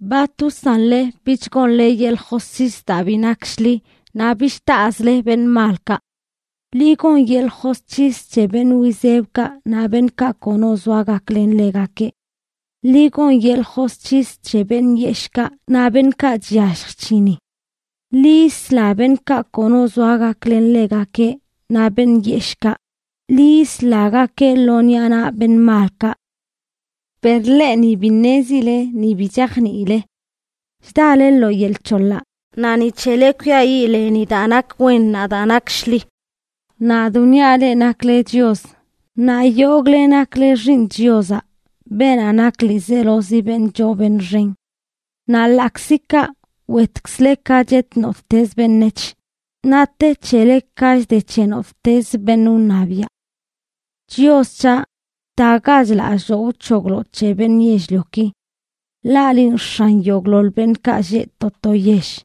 “¿Bat wsanle bich gonle yeḻꞌ josc̱his daa bi nak shḻi, naꞌ bich taꞌzle beṉꞌ malkaꞌ? ¡Ḻi gon yeḻꞌ josc̱his c̱he beṉꞌ wizebkaꞌ naꞌ beṉꞌkaꞌ kono zoa gaklen ḻegakeꞌ! ¡Ḻi gon yeḻꞌ josc̱his c̱he beṉꞌ yeshꞌkaꞌ naꞌ beṉꞌkaꞌ chyallj chc̱hini! Ḻi yisla beṉꞌkaꞌ kono zoa gaklen ḻegakeꞌ naꞌ beṉꞌ yeshꞌkaꞌ; ¡ḻi yislagakeꞌ lo ṉiꞌa naꞌ beṉꞌ malkaꞌ! “Per leꞌ ni bi ṉezile, ni bi chajniile. Chdale lo yel c̱holaꞌ, naꞌ ni c̱hele kwiayiꞌ leni daa nak wen naꞌ daa nak shḻi. Nadꞌ wniaꞌ leꞌ nakle chios; naꞌ yogꞌle nakle xiiṉ Chiozaꞌ, beenaꞌ nak ḻiizelozi beṉꞌ choo beṉꞌ xen. Naꞌ ḻaꞌkzi kaꞌ, wetkzle ka chet nottez beṉec̱h, naꞌ te c̱hele ka chde c̱he nottez beṉꞌ wṉabiaꞌ.” Chios c̱haꞌ, btagach lalloo wc̱hoglo c̱he beṉꞌ yell-lioki. Ḻaꞌ linꞌ x̱an yogꞌḻoḻ beṉꞌkaꞌ lleꞌ to to yell.